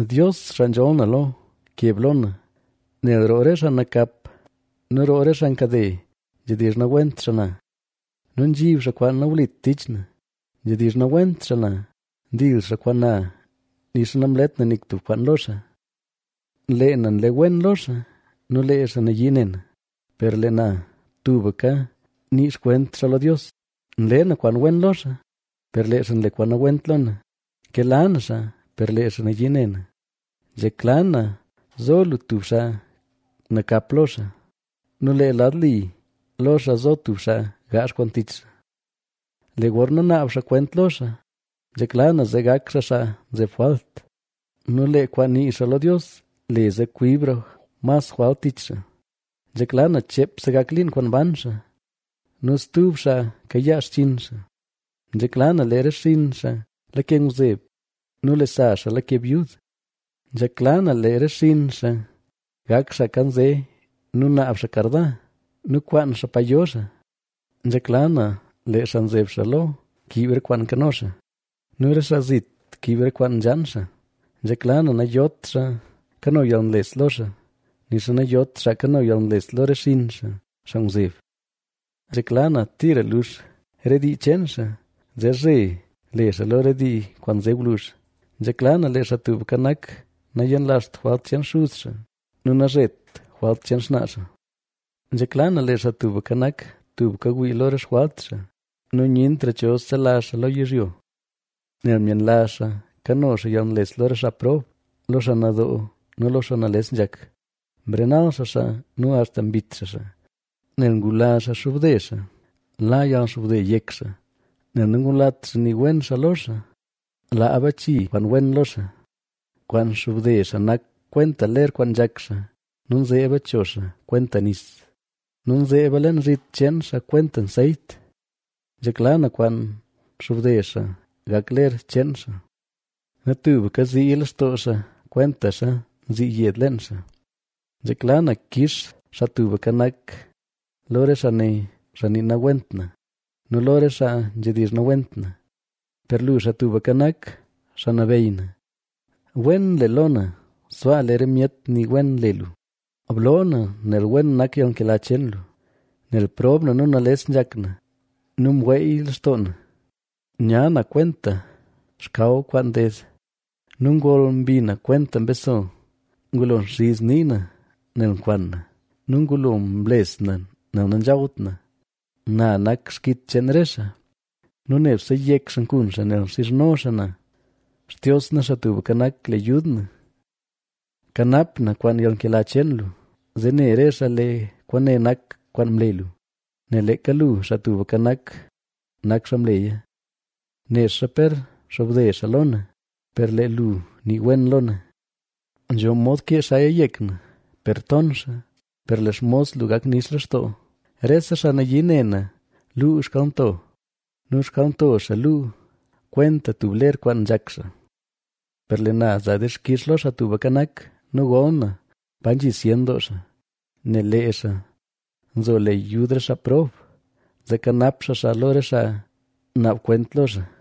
Dios, xaa nzholl na lo, keb lo na. Nel roo re xaa nakap nu roo re xaa nkade, nzhedizh nawent xaa na nu nzhib xaa kwaan nawlit tich na. Nzhedizh nawent xaa na, ndil xaa kwaan na nixa namlet na nik kwaan lo xaa. Lee na nle wen lo xaa, nu lee xaa nayii ne na, per lee na tubka nii xkwent xaa lo Dios. Nle na kwaan wen lo xaa, per lee xaa nle kwaan nawent lo na, nkela na xaa, per lee xaa nayii ne na. Nzhekla na zo lu tub xaa nakap lo xaa nu lee lad li lo xaa zo tub xaa gaazh kwaan tich xaa. Lee gorna naab xaa kwent lo xaa, nzhekla na zee gak xaa xaa nzeb jwalt nu lee kwaan nii xaa lo Dios le zee kwibra mas jwalt tich xaa. Nzhekla na cheepse gak liin kwaan ban xaa nu stub xaa kayaa xchinn xaa. Nzhekla na lee re xinn xaa lake ngwzeb nu lee sa xaa lake byud. Nzhekla na lee re xinn xaa gak xaa nkanze nu naab xaa karda nu kwaan xaa pa yo xaa. Nzhekla na lee xaa nzeb xaa lo kiib re kwaan nkano xaa nu re xaa zit kiib re kwaan nzhaan xaa. Nzhekla na nayot xaa kano yalnles lo xaa, nixa nayot xaa kano yalnles lo re xinn xaa, xaa ngwzeb. Nzhekla na tira lux re dii cheen xaa, zee zhe le xaa lo re dii kwaan nze gwluzh. Nzhekla na lee Xaa Tubka Nak, nayenlazht jwalt cheen xuz xaa nu nazhet jwalt cheen xnaa xaa. Nzhekla na lee Xaa Tubka Nak, tubka wii lo re xjwalt xaa nu nyentra cho selazh xaa lo yizhyo. Nel myenlazh xaa kano xaa yalnles lo re xaa prob, lo xaa nadoo nu lo xaa nales nzhak, mrenal xaa xaa nu axta mbit xaa xaa. Nel ngula xaa nxobde xaa, la yalxobde yek xaa, nel nangulat xaa nii wen xaa lo xaa, laa bachi kwaan wen lo xaa. Kwaan nxobde xaa nak kwenta ler kwaan nzhak xaa nu nzeeba cho xaa kwenta nis nu nzeeba leen zhit cheen xaa kwenta nseyt. Nzhekla na kwaan nxobde xaa gak ler cheen xaa nu tubka ziiya lextoo xaa kwentaxa nzii yed leen xaa. Nzhekla na kix Xaa Tubka Nak, lo re xaa ne, xaa nii nawent na nu lo re xaa nzhedizh nawent na. Per lu, Xaa Tubka Nak, Xaa Nabeyy na, wen le lo na sbaa lee re myet nii wen le lu; bloo na, nel wen nak yalnkela cheen lu. Nel prob na nu nales nzhak na nu mweey lextoo na. Nya na kwenta xkaw kwaan nded nu ngol mbi na kwenta mbeso. Ngulo nxiz nii na nel nkwan na nu ngulo mles na nel nanzhawt na. Na nak xkit cheen re xaa nu nebse yek xaa nkun xaa, nel nxizhno xaa na. Xtios na, Xaa Tubka Nak le yud na, ¡kanap na kwaan yalnkela cheen lu! Zee ne re xaa lee kwaane nak kwaan mle lu, nel leeka lu, Xaa Tubka Nak, nak xaa mleya. Nexa per xobde xaa lo na, per lee lu nii wen lo na. Nzho mod kee xaaya yek na, per ton xaa, per lee xmos lu gak nix lextoo. Rese xaa nayii ne na luu xkalnto, nu xkalnto xaa luu kwenta tub ler kwaan nzhak xaa. Per lee na za dixkix lo Xaa Tubka Nak nu gol na pa nzhi zyen doo xaa. Nel lee xaa nzo le yud re xaa prob, zee kanap xaa xaa lo re xaa naab kwent lo xaa.